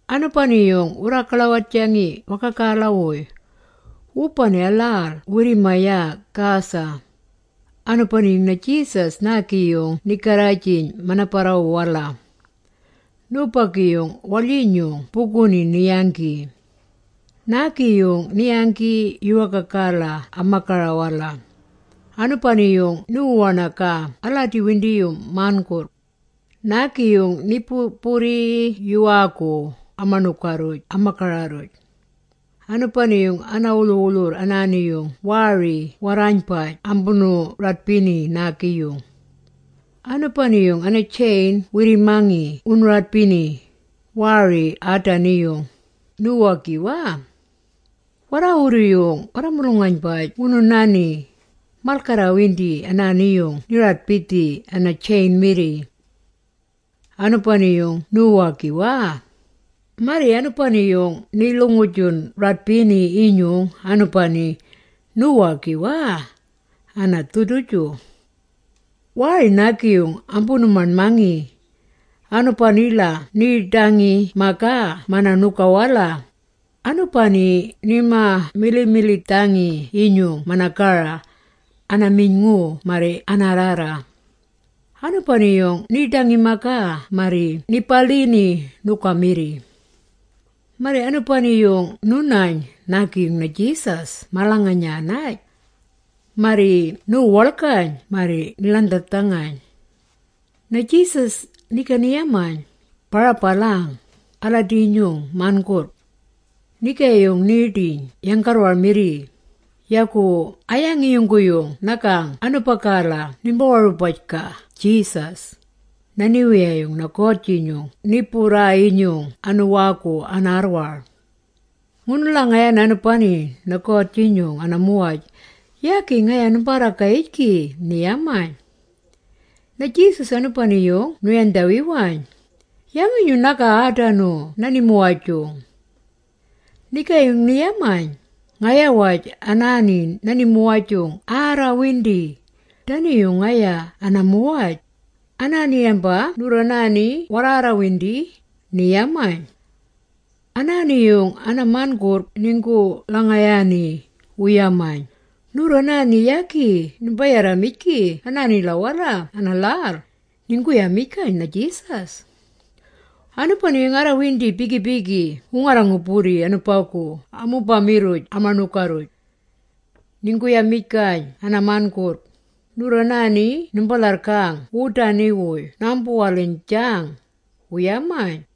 Anubani-yung wurraagaḻawajangi wagagala-wuy, wubani a-lhal wirri-mayana Gerasa. Anubani-yung na-Jesus naagi-yung ni-garrajiyn mana-barrawu-wala. Nubagi-yung waḻyinyung buguni ni-yanggi. Naagi-yung ni-yanggi yuwaagala ama-gara-wala. Anubani-yung niwu-waṉagaa aladi-windiyung man.gurrg. Naagi-yung ni-bu-burri yuwaagu ama-ṉuga-rruj ama-gara-rruj. Anubani ana-wulhu-wulhurr anaani-yung waari warraaynbaj ambunu-radbini naagi-yung. Anubani-yung ana-chain wirri-mangi wunu-radbini, waari aadani-yung, niwu-wagiwaa. Warraawurru-yung warra-mulung-aynbaj wunu-nani, malgarrawindi anaani-yung ni-radbidhi ana-chain-mirri. Anubani-yung niwu-warra-wagiwaa. Marri anubani-yung ni-lhuganda-radbidhi-yinyung anubagu, niwu-wagiwaa, ana-dhuduju. Waari naagi-yung ambunu-maṉdhangi. Anubanila niiḏangi-magaa mana-ṉuga-wala, anubagu nima-milimilidhangi-yinyung mana-gara, ana-miyn.ngu marri anaarrarra. Anubani-yung niiḏangi-magaa marri ni-balhini ṉuga-mirri. Marri anubani-yung nu-nayn naagi-yung na-Jesus malanganyanay. Marri ni-wuwaḻgayn marri ni-ḻandharrdhangayn. Na-Jesus ni-yamayn, “Ba-rabalang, aladi-nyung man.gurrg!” Nigaayung niiḏangi yanggarrwar-mirri, “Yagu a-yangi yungguyung nagang anubagala nimba-warubaj-gaa Jesus, na-Niwiyayung na-God-jinyung ni-burraa-yinyung anuwaagi anaarrwar? Ngunu-lhangayaana, anubani-yung na-God-inyung ana-muwaj, yagi ngaya nimbaarragayangijgi!” ni-yamayn. Na-Jesus anubani-yung nu-yandhawiwayn, “Yangi-nyung nagang aadanu na-nimuwaj-jung?” Nigaayung ni-yamayn, “Ngaya-waj anaani na-nimuwaj-jung ‘arrawindi’, dani-yung ngaya ana-muwaj, anaani yamba ngagurru warraarrawindi,” ni-yamayn. Anaani-yung ana-man.gurrg ninggu-lhangayaani, wu-yamayn, “Nurru anaani yagi nimbi-yarramijgi anaanila-wala ana-lhal,” ninggu-yamijgayn na-Jesus. Anubani-yung arrawindi bigi-bigi wu-ngarra-ngu-burri anubagu amubama-rruj ama-ṉuga. Ninggu-yamijgayn ana-man.gurrg, “Nurru anaani nimba-lharrgang wudanu-wuy naambu-waliynjang,” wu-yamayn.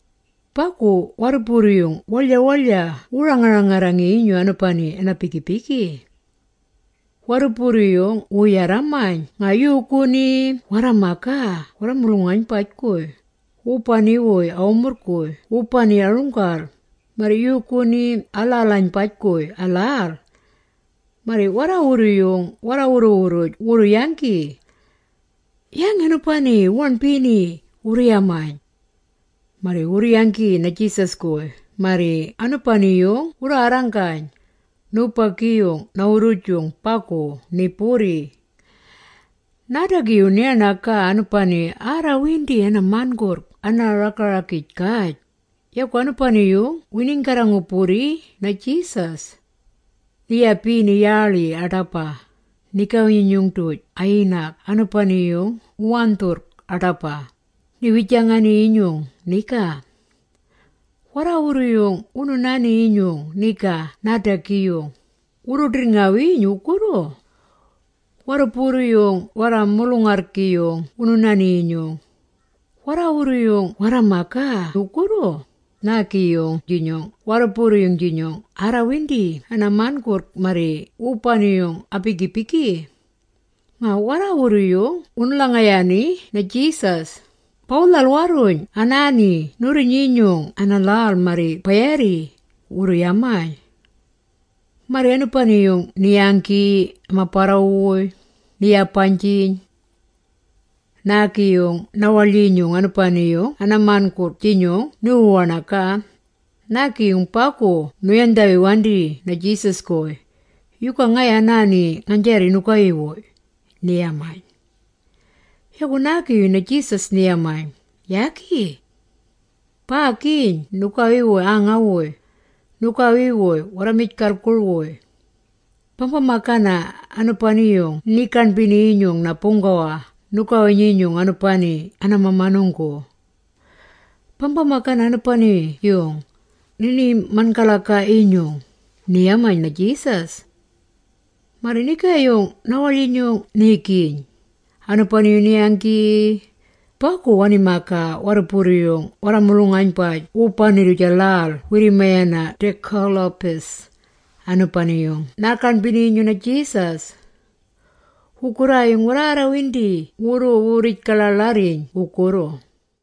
Bagu warruburru-yung warra-waḻya-waḻya wurru-ranga-rangarrangi-yinyung anubani-yung ana-bigi-bigi. Warruburru-yung wuu-yarramayn nga yuuguni warra-magaa warra-mulung-aynbaj-guy, wubani-wuy a-wumurrng-guy wubani a-runggal, marri yuuguni a-lhal-aynbaj-guy a-lhal. Marri warraawurru-yung warra-wurru-wurruj wurru-yanggi. “Yangi anubani wu-waṉbini?” wurru-yamayn. Marri wurru-yanggi na-Jesus-guy marri anubani-yung wurraarranggayn, nubagi-yung na-wurrujung bagu ni-burri. Naadagi-yung ni-waṉagaa anubani-yung arrawindi ana-man.gurrg ana-raga-ragij-gaj, yagu anubani-yung winiinggarra-ngu-burri na-Jesus. Ni-yabini yaaḻi aḏaba, nigawi-nyinyung-duj a-yinag anubani-yung wu-wandhurrg aḏaba, ni-wijangani-yinyung niga. Warraawurru-yung wunu-nani-yinyung niga naadagi-yung, wurru-ḏirrngawiiyn wugurru. Warruburru-yung warra-mulung-arrgi-yung wunu-nani-yinyung, warraawurru-yung warra-magaa wugurru, naagi-yung-jinyung wubani-yung-jinyung aarrawindi a-man.gurrg marri wubani-yung a-bigi-bigi. Nga warraawurru-yung wunu-lhangayaani na-Jesus, “Bawu-lhal-warruyn anaani nurri-nyinyung ana-lhal marri ba-yaarri!” wurru-yamayn. Marri anubani-yung ni-yanggi ama-barrawu-wuy, ni-yabaynjiyn. Nigaayung naagi-yung na-waḻyinyung anubani-yung ana-man.gurrg-jinyung niwu-waṉagaa, naagi-yung bagu nu-yandhawiwandi na-Jesus-guy, “Yuga ngaya anaani ngaynjaarri nugawi-wuy?” ni-yamayn. Yagu nigaayung na-Jesus ni-yamayn, “Yagi. Baagiyn nugawi-wuy aanga-wuy, nugawi-wuy warra-mijgalgur-wuy. Bamba-magana anubani-yung ninii-gaṉbini-yinyung na-Buunggawa nugawi-nyinyung, anubani-yung ana-mamanunggu. Bamba-magana anubani-yung, nini-man.galagaa-yinyung,” ni-yamayn na-Jesus. Marri nigaayung na-waḻyinyung niigiyn, anubani-yung ni-yanggi, bagu wani-magaa warruburru-yung warra-mulung-aynbaj wubani-rruj a-lhal wirri-mayaa Decapolis, anubani-yung naa-gaṉbini-yinyung na-Jesus. Wugurraayung warraarrawindi wurru-wurrij-gaḻaaḻarriyn wugurru.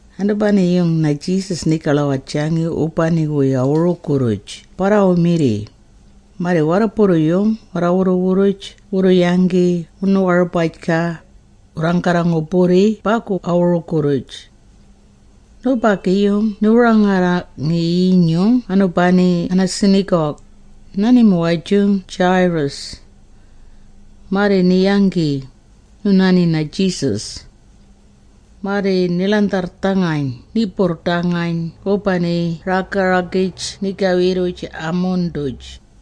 Anubani-yung na-Jesus niigaḻawajangi wubani a-wurugu-rruj barrawu-mirri, marri warruburru-yung wurru-wurruj wurru-yanggi wunu-warubaj-gaa, wurraanggarra-ngu-burri bagu a-wurugu-rruj. Nubagi-yung niwu-ranga-rangarrangi-yinyung anubani ana-synagog, na-nimuwaj-jung Jairus. Marri ni-yanggi, nu-nani na-Jesus. Marri ni-ḻandharrdhangayn ni-burrdangayn wubani raga-ragij nigawi-rruj a-mun-duj.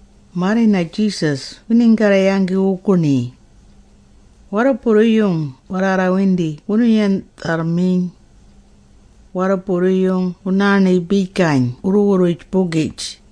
Marri na-Jesus winiinggarra-yanggi wuguṉi. Warruburru-yung warraarraarrawindi wunu-garrindharrmiyn. Warruburru-yung wunaaṉibijgayn wurru-wurruj-bugij.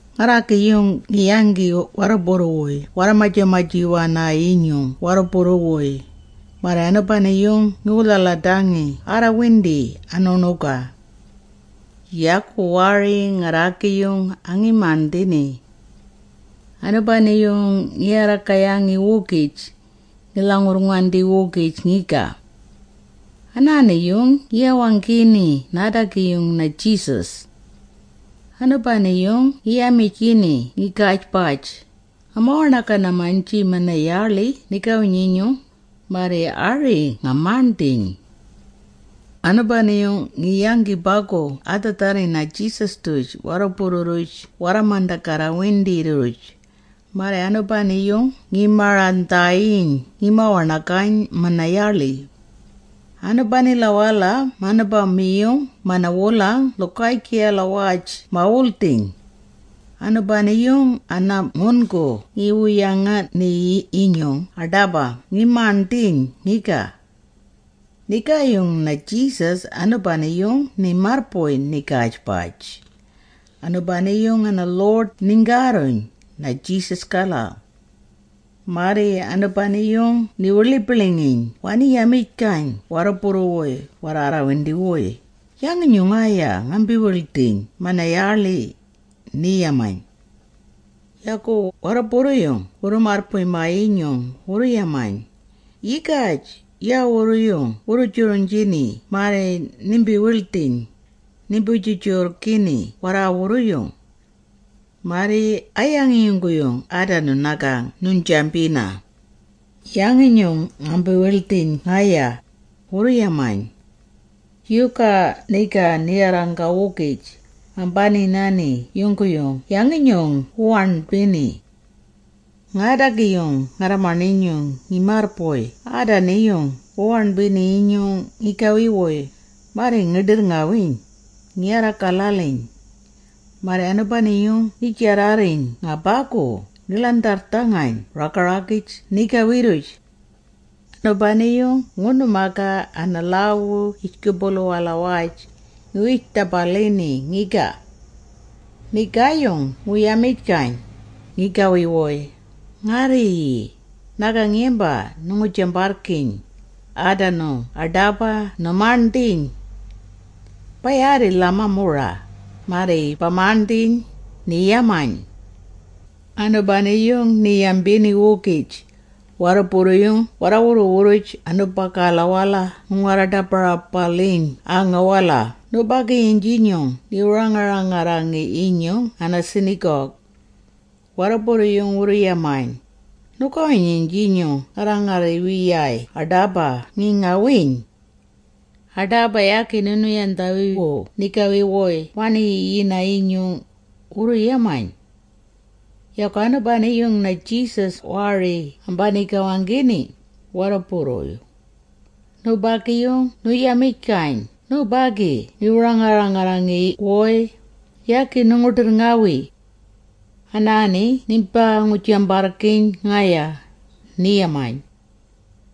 Ngarraagi-yung ngi-yanggi warruburru-wuy warra-maja-maji-wana-yinyung warruburru-wuy, marri anubani-yung ngiwu-lhaladangi arrawindi anu-ṉuga. Yagu waari ngarraagi-yung angi-maṉdhini. Anubani-yung ngi-warragayangi-wugij, ngi-lhangurrngandi-wugij ngiga. Anaani-yung ngi-wawanggini naadagi-yung na-Jesus. Anubani-yung ngi-yamijgini ngigaajbaj, “Ngama-waṉagang-maynji mana-yaaḻi nigawi-nyinyung, marri ari nga-maṉdhiiyn!” Anubani-yung ngi-yanggi bagu adhaadharri na-Jesus-duj warruburru-rruj warra-mandagarrawindi-rruj, marri anubani-yung ngi-marang-dhaayiyn ngima-waṉagayn mana-yaaḻi. Anubanila-wala manubama-yung mana-wulang lhugaajgiyalawaj ma-wuldhiyn. Anubani-yung ana-ngun.gu ngi-yangini-yinyung aḏaba ngi-maṉdhiiyn ngiga. Nigaayung na-Jesus anubani-yung ni-marrbuy nigaajbaj, anubani ana-lhuḏ ninggaarruyn, na-Jesus-gala. Marri anubani-yung ni-wiḻibiḻingiyn wani-yamijgayn warruburru-wuy warraarraarrawindi-wuy, “Yangi-nyung ngaya ngambii-bildhiyn mana-yaaḻi?” ni-yamayn. Yagu warruburru-yung wurru-marrbuy-maa-yinyung wurru-yamayn, “Yigaj, yaawurru-yung wuu-juriynjini marri nimbii-bildhiyn, nimbi-jurrjurrgina warraawurru. Marri a-yangi yungguyung aadanu nagang nuynjambina, ‘Yangi-nyung ngambi-wildhiyn ngaya?’” wurru-yamayn. Yagu niga ni-warranggaa-wugij, ambani-nani yungguyung yangi-nyung wu-waṉbini. Ngaadagi-yung ngarra-maṉinyung ngi-marrbuy aadani-yung wu-waṉbini-yinyung ngigawi-wuy, marri ngi-ḏirrngawiiyn, ngi-warra-galaliyn. Marri anubani-yung ngi-jarrarriyn nga bagu ngi-ḻandharrdhangayn raga-ragij nigawi-rruj. Anubani-yung ngunu-magaa ana-lhaawu yijgubulu-walawaj, ngi-wij-ḏabalini ngiga. Nigaayung ngu-yamijgayn, ngigawi-wuy, “Ngarriiyi, nagang yamba nu-ngu-jambarrgiiyn, aadanu aḏaba nu-maṉdhiiyn. Ba-yaarri, ba-lhamaamura, marri ba-maṉdhiiyn,” ni-yamayn. Anubani-yung ni-yambini-wugij, warruburru-yung warra-wurru-wurruj anubagala wuu-ngarra-ḏaba-rabaliyn aanga-wala nubagi-yung-jinyung niwu-ranga-rangarrangi-yinyung ana-synagog. Warruburru-yung wurru-yamayn, “Nugawi-nyinyung ngarra-ngarriwiyaay aḏaba ngi-ngawiiyn. Aḏaba yagi nunu-yandhawiwu nigawi-wuy wani-yiyina-yinyung,” wurru-yamayn. Yagu anubani-yung na-Jesus waari ambanii-gawanggini, warruburru-yung. Nubagi-yung nu-yamijgayn nubagi niwu-ranga-rangarrangi-wuy, “Yagi nu-ngu-ḏirrngawi. Anaani nimbaa-ngu-jambarrgiiyn ngaya,” ni-yamayn.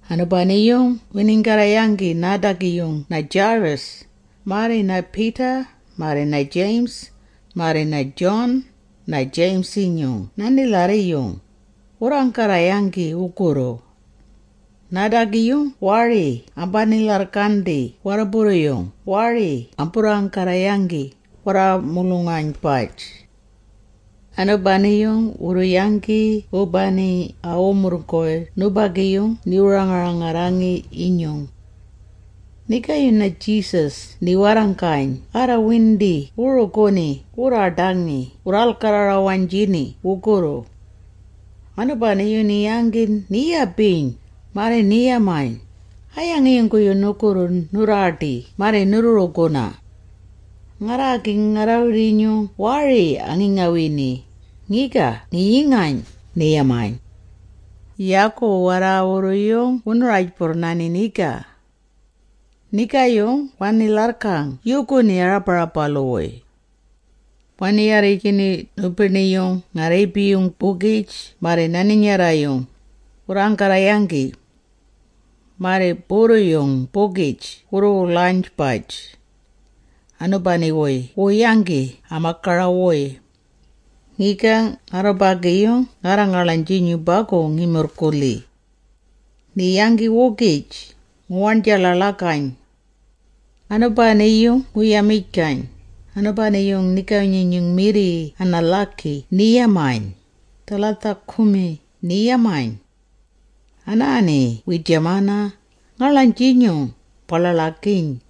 Anubani-yung winiinggarra-yanggi naadagi-yung na-Jairus, marri Peter, marri James, marri John, na-James-inyung na-nilharri-yung, wurraanggarra-yanggi wugurru. Naadagi-yung waari ambani-lharrgandi warruburru-yung waari amburraanggarra-yanggi, warra-mulung-aynbaj. Anubani-yung wurru-yanggi wubani a-wumurrng-guy nubagi-yung niwu-ranga-rangarrangi-yinyung. Nigaayung na-Jesus ni-warranggayn arraarrawindi wuu-ruguni… wurraaḏangi… wurraalgarra-rawaynjini wugurru. Anubani-yung ni-yanggi ni-yabiyn, marri ni-yamayn, “A-yangi yungguyung nugurru nurraaḏii marri nuu-ruguna? Ngarraagi ngarra-wirrinyung waari angi-ngawini, ngiga ngi-yingayn,” ni-yamayn. Yagu warraawurru-yung wunu-rajburrnani niga. Nigaayung wani-lharrgang yuuguni aa-ḏabarabalu-wuy. Wani-yarrijgini nubiṉi-yung nga-rriibi-yung-bugij marri na-ninyarra-yung, wurraanggarra-yanggi. Marri burru-yung-bugij wurru-wulaynbaj. Anubani-wuy wuu-yanggi ama-gara-wuy. Ngiga ngarrubagi-yung ngarra-ngaḻaynjinyung bagu ngi-murrgulhi. Ni-yanggi-wugij, ngu-waṉja-ḻaḻagayn. Anubani-yung ngu-yamijgayn, anubani-yung nigawi-nyinyung-mirri ana-lhaagi ni-yambiyn, “Talitha kumi!” ni-yamayn. Anaani wiijamana, “Ngaḻaynjinyung, ba-ḻaḻagiiyn!”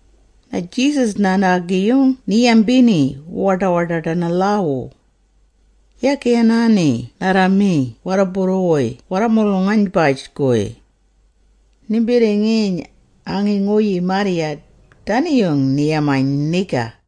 Na-Jesus anaani-yung ni-yambini wu-waḏa-waḏaḏ ana-lhaawu. “Yagi anaani narra-magi warruburru-wuy warra-mulung-aynbaj-guy. Nimbirringiiyn, angi-nguyii marrya,” Dani-yung ni-yamayn niga.